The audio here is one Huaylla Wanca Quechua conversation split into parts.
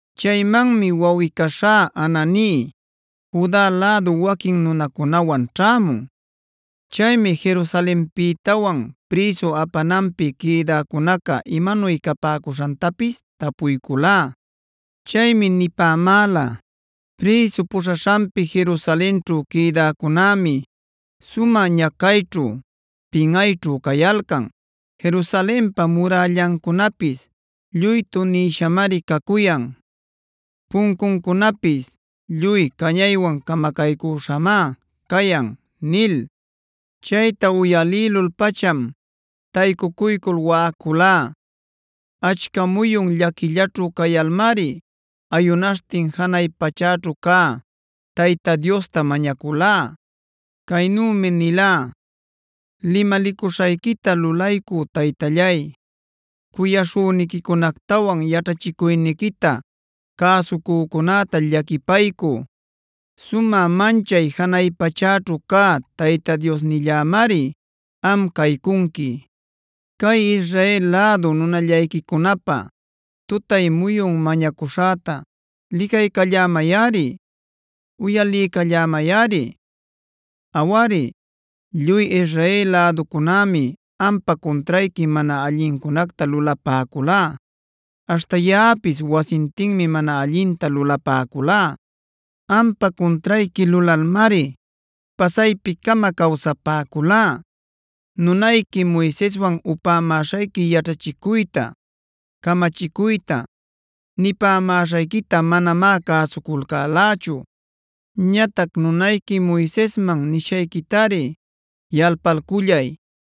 Chaymanmi wawꞌi-caśhá Hanani Juda lädu waquin nunacunawan ćhämun. Chaymi Jerusalenpïtawan prïsu apananpi quïdäcunaca imanuy capäcuśhantapis tapuyculá. Chaymi nipämäla: “Prïsu puśhaśhanpi Jerusalenćhu quïdäcunämi sumä ñacayćhu, pinꞌayćhu cayalcan. Jerusalenpa murällancunapis lluy tunïshamari cacuyan. Puncuncunapis lluy cañaywan camacaycüśhamá cayan” nil. Chayta uyalïlul-pacham taycucuycul waꞌaculá. Achca muyun llaquillaćhu cayalmari ayunaśhtin janay pachäćhu cä Tayta Diosta mañaculá. Caynümi nilá: “Limalicuśhayquita lulaycü Taytallay, cuyaśhüniquicunactawan yaćhachicuyniquita cäsucücunäta llaquipaycü, sumä manchay janay pachäćhu cä Tayta Diosnillämari am caycunqui. Cay Israel lädu nunallayquicunapä tutay muyun mañacuśhäta licaycallämayꞌari, uyaliycallämayꞌari. Awari, lluy Israel läducunämi ampa cuntrayqui mana allincunacta lulapäculá; aśhta yaꞌapis wasintinmi mana allinta lulapäculá. Ampa cuntrayqui lulalmari pasaypi-cama cawsapäculá. Nunayqui Moiseswan upämäśhayqui yaćhachicuyta, camachicuyta, nipämäśhayquita manamá cäsuculcälächu. Ñatac nunayqui Moisesman nishayquitari yalpalcullay: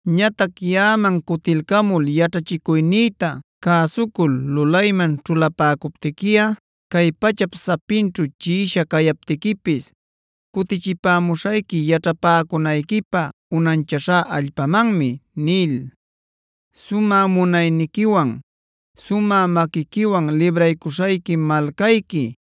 Ñatac yaꞌaman cuticalcämul yaćhachicuynïta cäsucul lulayman ćhulapäcuptiquiꞌa cay pachap sapinćhu chiꞌisha cayaptiquipis cutichipämuśhayqui yaćhapäcunayquipä unanchaśhá allpamanmi’ nil.c “Sumä munayniquiwan, sumä maquiquiwan libraycuśhayqui malcayqui,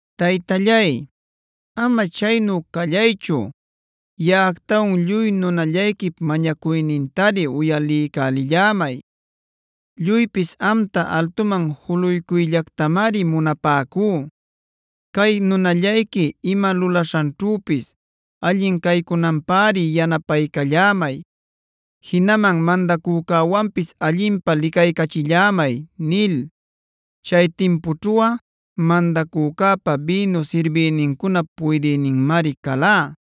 Taytallay, ama chaynu callaychu yaꞌactawan lluy nunallayquip mañacuynintari uyaliycälillämay. Lluypis amta altuman juluycuyllactamari munapäcú. Cay nunallayqui ima lulaśhanćhüpis allin caycunanpäri yanapaycallämay, jinaman mandacücäwanpis allinpä licaycachillämay” nil. Chay timpućhuꞌa mandacücäpa bïnu sirbïnincunap puydïninmari calá.